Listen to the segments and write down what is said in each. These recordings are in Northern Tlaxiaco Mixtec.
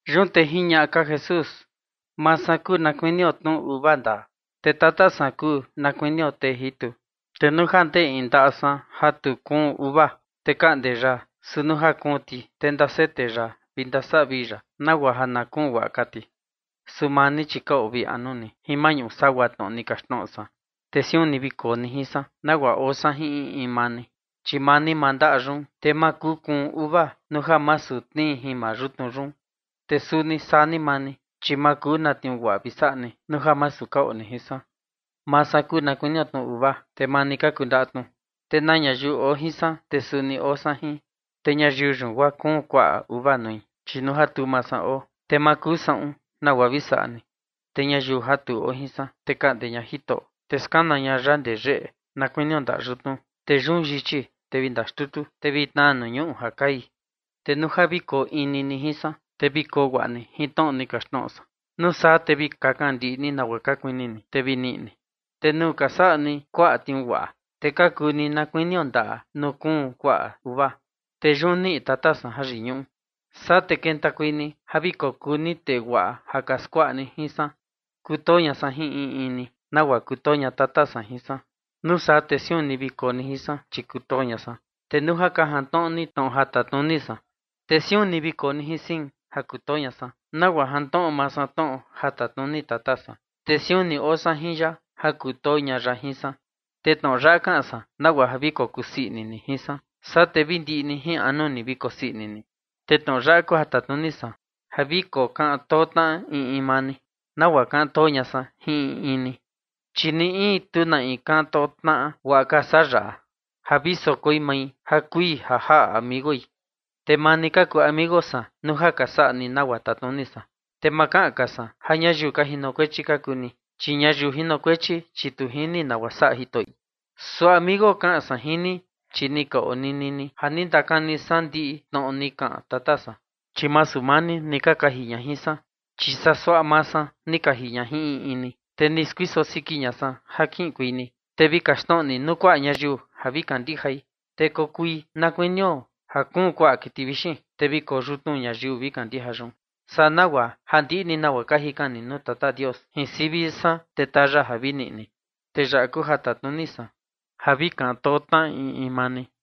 Yun te jiñaꞌa ka Jesús: ―Maa san kuu na kuinio tnu uva ndaa, te Tata san kuu na kunio tee jitu. Te nuu ja ndee in ndaꞌa san ja tu kuun uva, te kaꞌnde ya, su nuu ja kuun ti, te ndasete ya vi ndasavii ya nagua ja na kuun guaꞌa ka ti. Su maa ni, chi ka oo vii anu ni jin maꞌñu sagua tnoꞌo ni kaxtnoꞌo san. Te siun ni vi koo ni jin san, nagua oo san jin in in maa ni. Chi maa ni maa ndaꞌa yun, te ma kuu kuun uva nuu ja masu tnii jin maa yutnu yun. Te suni saa ni maa ni, chi ma kuu na tniuu guaꞌa vi saꞌa ni nuu ja masu ka oo ni jin san. ’Maa san kuu na kuinio tnu uva, te maa ni ka kuu ndaꞌa tnu, te na ñayiu oo jin san, te suni oo san jin. Te ñayiu yun, guaa kuun kuaꞌa uva nui, chi nuu ja tu maa san oo, te ma kuu saꞌun nagua vi saꞌa ni. Te ñayiu ja tu oo jin san, te kaꞌnde ña Jitoꞌo, te skana ña ya ndee yeꞌe, na kuinio ndaꞌa yutnu, te yun yichi, te vi ndaxtutu, te vi tnaa nuu ñuꞌu ja kai. Te nuu ja vi koo ni maa ni jin san, te vi koo guaꞌa ni jin tnoꞌo ni kaxtnoꞌo san, nuu saa te vi kakan ni ndiꞌi nagua ka kuini ni, te vi niꞌi ni. Te nuu ka saꞌa ni kuaꞌa tniuu guaꞌa, te ka kuu ni na kuinio ndaꞌa nuu kuun kuaꞌa uva, te yun niꞌi Tata san jayiñuꞌu. Saa te kentakuei ni ja vi kokuu ni tee guaꞌa ja ka skuaꞌa jin san. ’Kutoo ña san jin in in ni, nagua kutoo ña Tata san jin san. Nuu saa te siun ni vi koo ni jin san, chi kutoo ña san. Te nuu ja ka jantnoꞌo ni tnoꞌo ja tatnuni san, te siun ni vi koo ni jin san ja kutoo ña san, nagua jantnoꞌo maa san tnoꞌo ja tatnuni Tata san, te siun ni oo san jin ya ja kutoo ña ya jin san. Te tnoꞌo yaꞌa kaꞌan san nagua ja vi kokusii ini ni jin san, saa te vi ndiꞌi ni jin anu ni vi kosii ini ni. Te tnoꞌo yaꞌa kuu ja tatnuni san: Ja vi kokaꞌan too tnaꞌa in in maa ni, nagua kaꞌan too ña san jin in in ni. Chi ni in, tu na in kaꞌan too tnaꞌa guaꞌa ka saa yaꞌa: ja vi sokoi mai ja kui ja jaꞌa amigoi. Te maa ni ka kuu amigo san nuu ja ka saꞌa ni nagua tatnuni san. Te ma kaꞌan ka san ja ñayiu ka jinokuechi ka kuu ni, chi ñayiu jinokuechi, chi tu jini nagua saꞌa jitoꞌi. Su amigo kaꞌan san jin ni, chi ni ka onini ni ja ni ndakani san ndiꞌi tnoꞌo ni kaꞌan Tata san. Chi masu maa ni ni ka kaji ña jin san, chi suaꞌa maa san ni kaji ña jin in in ni, te ni skuiso siki ña san ja kiꞌinkuei ni, te vi kaxtnoꞌo ni nuu kuaꞌa ñayiu ja vi kandijai, te kuu na kuinio ja kuun kuaꞌa kiti vixin, te vi koyutnu ñayiu vi kandija yun. Saa nagua ja ndiꞌi ni nagua ka jikan ni nuu Tata Dios jin sivi san, te taa ya vi niꞌi ni. Te yaꞌa kuu ja tatnuni san: Ja vi kaꞌan too tnaꞌa in in maa ni.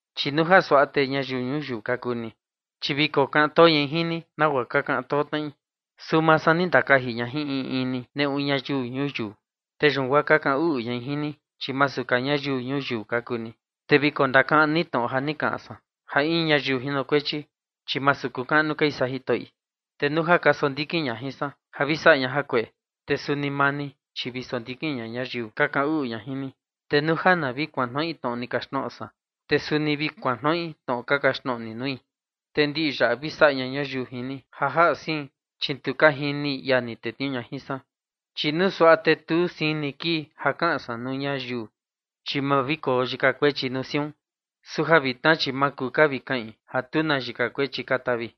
Chi nuu suaꞌa te ñayiu ñuyiu ka kuu ni, chi vi kokaꞌan too ñai jin ni, nagua ka kaꞌan too tnaꞌi. Su maa san ni ndakaji ña jin in in ni neꞌu ñayiu ñuyiu. Te yun guaa ka kaꞌan uꞌu ñai jin ni, chi masu ka ñayiu ñuyiu ka kuu ni. Te vi kondakaꞌan ni tnoꞌo ja ni kaꞌan san, ja in ñayiu jinokuechi, chi masu kuu kaꞌnu kai saa jitoꞌi. Te nuu ja ka sondikin ña jin san ja vi saꞌa ña jakueꞌe, te suni maa ni, chi vi sondikin ña ñayiu ka kaꞌan uꞌu ña jin ni. Te nuu ja na vi kuantnoꞌi tnoꞌo ni kaxtnoꞌo san, te suni vi kuantnoꞌi tnoꞌo ka kaxtnoꞌo ni nui. Te ndiꞌi yaꞌa vi saꞌa ña ñayiu jin ni ja jaꞌa sein, chi tu ka jini ia ni tetniuu ña jin san. Chi nuu suaꞌa te tu sein ni kii ja kaꞌan san nuu ñayiu, chi ma vi koo yika kuechi nuu siun. Su ja vitna, chi ma kuu ka vi kaꞌin ja tu na yika kuechi ka tavi.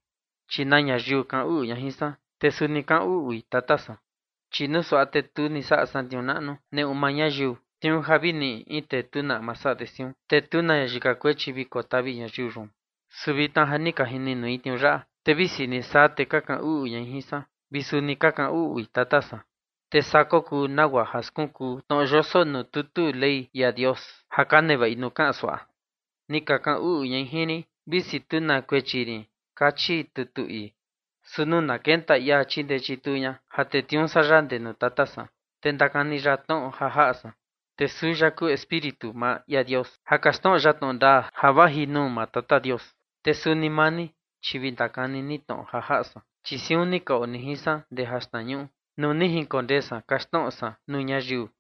Chi na ñayiu kaꞌan uꞌu ña jin san, te suni kaꞌan uꞌui Tata san. Chi nuu suaꞌa te tu ni saꞌa san tniuu naꞌnu neꞌu maa ñayiu, tniuu ja vi ni in tee tu na ama saꞌa de siun, te tu na yika kuechi vi kotavi ñayiu yun. Su vitna ja ni ka jini nui tniuu yaꞌa, te visi ni saa, te ka kaꞌan uꞌu ñai jin san vi suni ka kaꞌan uꞌui Tata san. Te saa kokuu nagua ja skunkuu tnoꞌo yoso nuu tutu Ley ia Dios ja ka nevaꞌi nuu kaꞌan suaꞌa: Ni ka kaꞌan uꞌu ñai jin rin, visi tu na kuechi rin kachi tutu ii. ’Su nuu na kenta ia chindee chituu ña ja tetniuu san ya ndee nuu Tata san, te ndakani ya tnoꞌo ja jaꞌa san. Te suu ya kuu Espíritu maa ia Dios ja kaxtnoꞌo ya tnoꞌo ndaa ja vaji nuu maa Tata Dios. Te suni maa ni, chi vi ndakani ni tnoꞌo ja jaꞌa san, chi siun ni ka oo ni jin san ndee jaxtnañuꞌu nuu ni jinkondee san kaxtnoꞌo san nuu ñayiu.